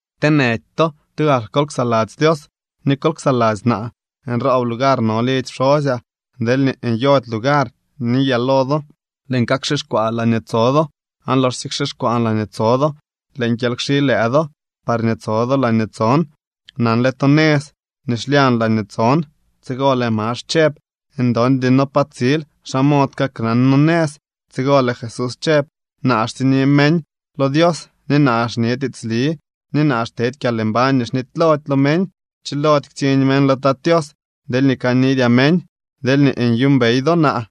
’Kteenëdy to. Tugak kol ksaladzy Dios ni kol ksaladzy naa. Nroob lugar no lidzy pxosyaa. Deelñee nyody lugar, niyaa lo do. Lëën kakxixkwaa laañee tso do. Aan loxsye kxixkwaan laañee tso do, lëën kyely kxi lëë do, parñee tso do laañee tson. Nanle to nëz nii xlyañ laañee tson. Tsigo lëë Max chëb: —Ndondy noo pa tsil. ¿Xa mod kaknan noo nëz? Tsigo lëë Jesús chëb: —Naa xtsiñni meñ lo Dios ni naa xñe tiitsli ni naa xtedy kyalmbañ nii xnitylody lo meñ. Chilody ktsiñ meñ lo Tat Tios deelñee kanidyaa meñ. Deelñee nyuumbey do naa,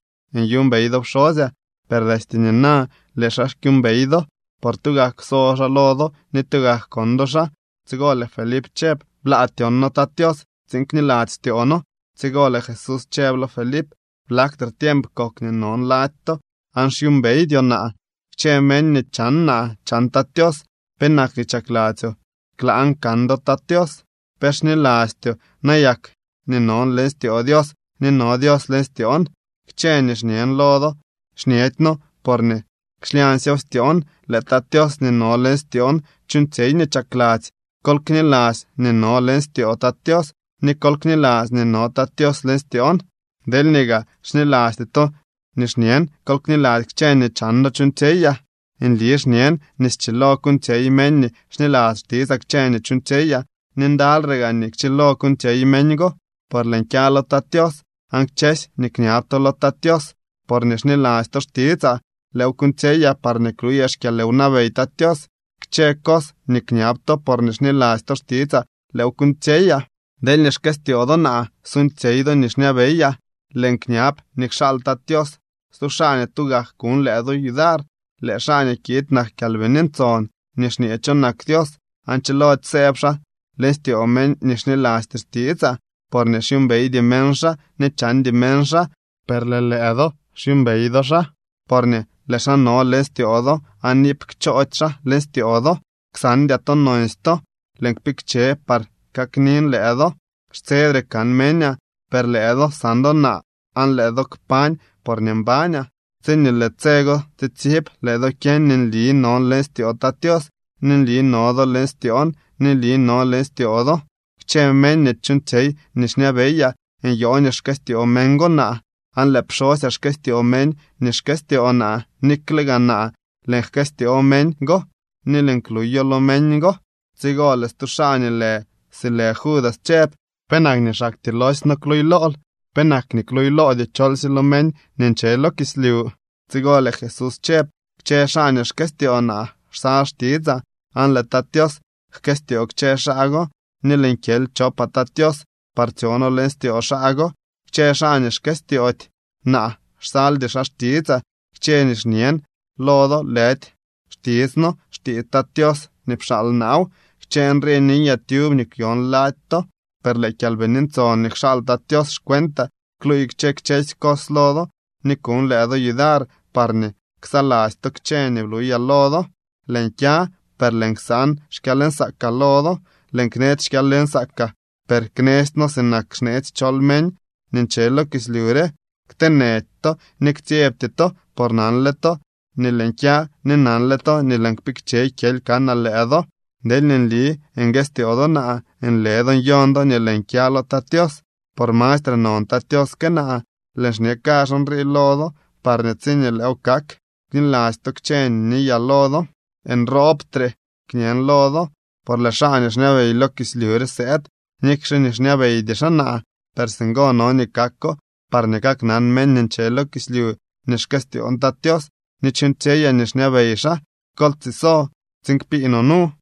nyuumbey do pxosyaa. Per destye nina lëë xaa kyuumbey do, por tugak kwso xaa lo do ni tugak kon do xaa. Tsigo lëë Felip chëb: —Blaa tyon noo Tat Tios tsiin kniladzy styoo noo. Tsigo lëë Jesús chëb lo Felip: —¿Blaktre tiemp kok nii non lady to, aan xyuumbeydyoo naa? Kchë meñ nii chan naa chan Tat Tios. ¿Penak nii chakladzyoo klaan kan do Tat Tios? ¿Pe xnilastyoo nayak nii non leñ styoo Dios ni no Dios leñ styoon? Kchë nii xñen lo do xñedyno porñee xlyañsyew styoon. Lëë Tat Tios nii no leñ styoon chuuñtsyey nii chakladzy. Kol kniladzy nii non leñ styoo Tat Tios ni kol kniladzy nii no Tat Tios leñ styoon. Deelñee gaa xnilasty to nii xñen, kol kniladzy kchë nii chan do chuuñtsyeyaa. Nli xñen nii schilo kuuñtsyey meñ nii xniladzy xtitsaa kchë nii chuuñtsyeyaa ni ndalyre gaa nii kchilo kuuñtsyey meñ go, por lëën kya lo Tat Tios. Aan kchësy nii kñab to lo Tat Tios porñee xniladzy to xtitsaa, lëëw kuuñtsyeyaa parñee kluyaa xkyalwnabey Tat Tios. Kchë cos nii kñab to porñee xniladzy to xtitsaa, lëëw kuuñtsyeyaa. ’Deelñee xkëstyoo do naa, suuñtsyey do nii xñabeyaa. Lëën kñab nii kxaal Tat Tios stu xaa nii tugak kuñ lëë do yudar. Lëë xaa nii kiid nak Kyalbini Ntson nii xñee cho nak Dios aan chilody sëëb xaa leñ styoo meñ nii xnilasty xtitsaa, porñee xyuumbeydy meñ xaa ni chandy meñ xaa. Per lëë lëë do xyuumbey do xaa, porñee lëë xaa no leñ styoo do aan iip kchoody xaa leñ styoo do. Ksandyaa to nonsy to, lëën kpikche par kaknin lëë do. Xtsedre kan meñaa, per lëë do san do naa aan lëë do kpañ porñee mbañaa. Tsi lëë tse go tsitsib lëë do kyeñ nii nli non leñ styoo Tat Tios, ni nli no do leñ styoon, ni nli non leñ styoo do. Kchë meñ nii chuuñtsyey nii xñabeyaa, nyoo nii xkëstyoo meñ go naa. Aan lëë pxosyaa jkëstyoo meñ nii xkëstyoo naa, nikle gaa naa lëën jkëstyoo meñ go ni lëën kluylo lo meñ go. Tsigo lëë stu xaa nii lë si lë Judas chëb: —¿Penak nii xaktyee loosy noo kluuylool? ¿Penak nii kluuyloodyoo cholsye lo meñ nii nche lo kislyu? Tsigo lëë Jesús chëb: —Kchë xaa nii xkëstyoo naa xsal xtitsaa, aan lëë Tat Tios jkëstyoo kchë xaa go, ni lëën kyely chopaa Tat Tios par tsyo noo leñ styoo xaa go. Kchë xaa nii xkëstyoody naa xsaldy xaa xtitsaa. Kchë nii xñen lo do lëdy xtitsno, xtiits Tat Tios nii pxaal naaw. ’Kchë nrii niyaa tyub nii kwyon lady to. Per lëë Kyalbini Ntson nii kxaal Tat Tios xcuentaa kluuy kchë kchësy cos lo do ni kuñ lëë do yudar parñee ksaladzy to kchë nii bluylaa lo do. ’Lëën kya, per lëën ksan xkyalnsaakaa lo do. Lëën knetsy xkyalnsaakaa, per knestyno sinak xneetsy chol meñ nii nche lo kislyu rew. Kteenëdy to ni ktsyebty to, por nanle to nii lëën kya, ni nanle to nii lëën kpikche kyely kanaa lëë do. Deelñee nli nguëstyoo do naa, nle do nyon do nii lëën kya lo Tat Tios, por mastre non Tat Tios que naa. Lëën xñe kazh nrii lo do parñee tsiñee lëëw kak, kniladzy to kchë nii niyaa lo do. ’Nroobdre kñen lo do, por lëë xaa nii xñabey lo kislyu re sëëd. Nikxe nii xñabeydy xaa naa, per singo no nii kako parñee kaknan meñ nii nche lo kislyu nii xkëstyoon Tat Tios ni chuuñtsyeyaa nii xñabey xaa. Kol tsiso tsiin kpii no nu.